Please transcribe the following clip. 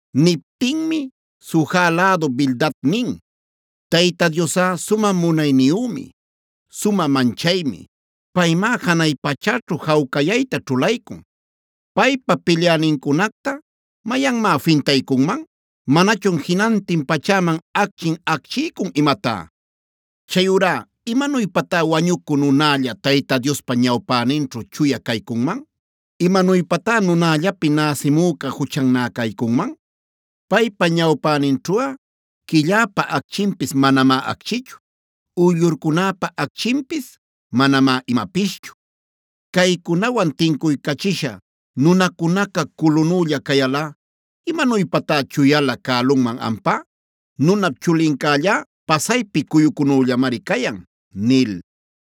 Niptinmi Suja lädu Bildad nin: “Tayta Diosꞌa sumä munayniyümi, sumä manchaymi. Paymá janay pachäćhu jawcayayta ćhulaycun. ¿Paypa pilyänincunacta mayanmá fintaycunman? ¿Manachun jinantin pachäman acchin acchiycun imatá? Chayurá, ¿imanuypatá wañucü nunälla Tayta Diospa ñawpäninćhu chuya caycunman? ¿Imanuypatá nunallapi näsimüca juchannä caycunman? Paypa ñawpäninćhuꞌa quilläpa acchinpis manamá acchichu; uyllurcunäpa acchinpis manamá imapischu. Caycunawan tincuycachisha nunacunaca culunülla cayalꞌa, ¡imanuypatá chuyalä cälunman ampá! Nunap chulincällá pasaypi cuyucunüllamari cayan” nil.